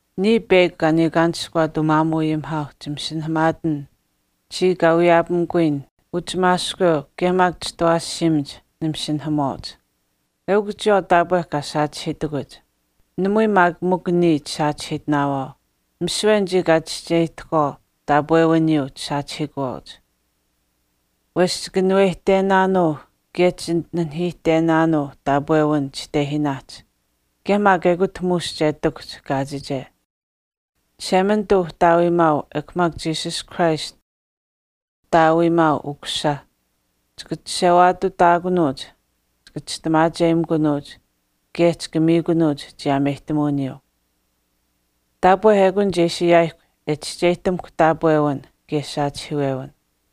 Niya peyakw kaa niikaanishkuwaat umaamuuayimihaauh chimasinahamaatin chiya kaa wiyaapamikuyin uchimaashkweu kaye maak Chitawaashiimach nimasinahamuwaauch. Eukw chiyawaau taapwe kaa saachihiitakuch. Namui maak mikw niya chisaachihiitinaawaau. Misiwe kaye anichii kaa chischeyihtahkwaau taapwewiniyuu chisaachihiikuwaauch. Wesh chikanuweyihtenaanuu kaye chinanihiihtenaanuu taapwewin chitehiinaahch kaye maak ekut muush che ihtakuhch kaachiche. Chishemanituu Uhtaawiimaau ekw maak Jesus Christ aniyuuh Uhtaawiimaau Ukusisa chika chishewaatutaakunuuch, chika chistimaacheyimikunuuch kaye chika miikunuuch chiyaameyihtamuwiniyuu. Taapwe ekun che ishi ayaayihkw e chischeyihtamuhkw taapwewin kaye saachihiiwewin.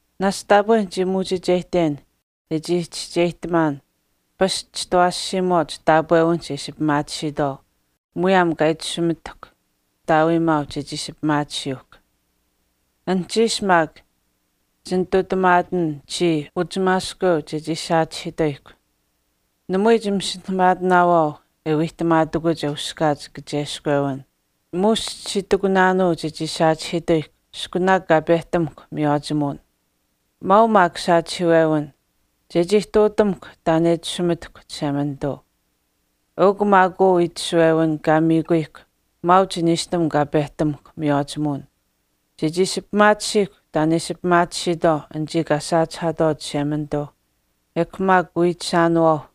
Naashch taapwe nichii muuchicheyihten iskutak chescheyihtamaan pasch chitawaashiimach taapwewinihch e ishi pimaatisiitwaau mwehch aniyuu kaa itashumitahkw Uhtaawiimaau chechii ishi pimaatisiyuuhkw. Anuhchiish maak chinitutamaatin chiya uchimaashkweu chechii saachihiituyihkw. Namui chimasinahamaatinaawaau e wiihtamaatakuch e uskaach kacheskwewin, muush chichii itikunaanuu chechii saachihiituyihkw iskunaak kaa pehtamuhkw miywaachimuwin. Mwaau maak saachihiiwewin, chechii ihtuutamuhkw taan e itashumitahkw Chishemanituu. Eukw maak uu itashuwewin kaa miikuyihkw maauch niishtam kaa pehtamuhkw miywaachimuwin, chechii ishi pimaatisiihkw taan e ishi pimaatisiitwaau anichii kaa saachihaatwaau Chishemanituuh kaye wiichishaanuwaauh.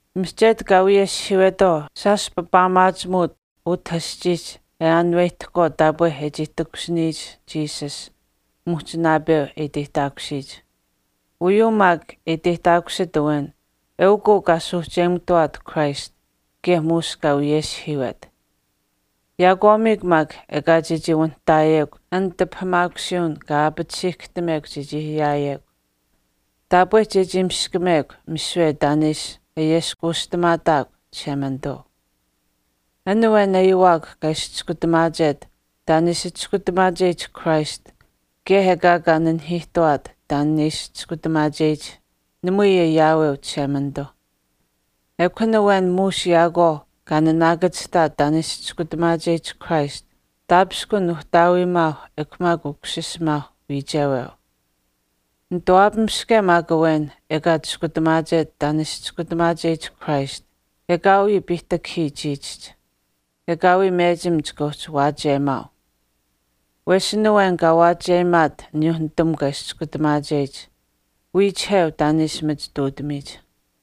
Mihchetu kaa wiyeshihiiwetwaau shaash papaamaachimuuch utah aschiihch e aanuwehtahkwaau taapwe e chii takushiniyich Jesus muhch naapeu e chii iteyihtaakusiyich. Uyuu maak e iteyihtaakusit awen eukw uu kaa suuhcheyimututawaat Christ kaye muush kaa wiyeshihiiwet. Yaakwaamiikw maak ekaa chechii wanihtaayekw an tipahamaakusiiwin kaa aapatisiihkahtamekw chechii ayaayekw, taapwe chechii miskamekw misiwe taan e ishi ayeskuushtamaataakw Chishemanituu. An awen ayiwaak kaa ishi chiskutamaachet taan e ishi Chiskutamaacheyich Christ kaye ekaa kaa nanihiihtuwaat taan kaa ishi chiskutamaacheyich namui ayaaweu Chishemanituuh. Ekw an awen muush yaakwaau kaa naanaakachihtaat taan e ishi Chiskutamaacheyich Christ taapishkun Uhtaawiimaau ekw maak Ukusisimaau wiicheweu. Nituwaapamiske maak awen ekaa chiskutamaachet taan e ishi Chiskutamaacheyich Christ ekaawii piihtakahii chiichihch. Ekaawii mechim chika uhchi waachiyemaau. Wesh an awen kaa waachiyemaat aniyuuh nitamukw kaa ishi chiskutamaacheyich wiichiheu e machituutamiyich.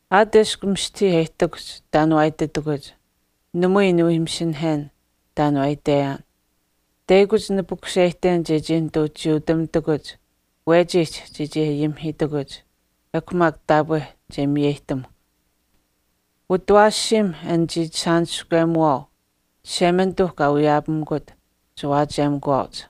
Aat eshkw mistahii e ihtakuhch taan waa ititakuch, namui niwii masinahen taan waa itweyaan. Teyakuch nipukuseyihten chechii nituu chiyuutamitakuch wechiihch chechii ayimihiituyihkw ekw maak taapwe che miyeyihtamuhk. Utawaashiimh an chiichishaaniskwemuwaau Chishemanituuh kaa wiyaapamikut chiwaachiyemikuwaauch.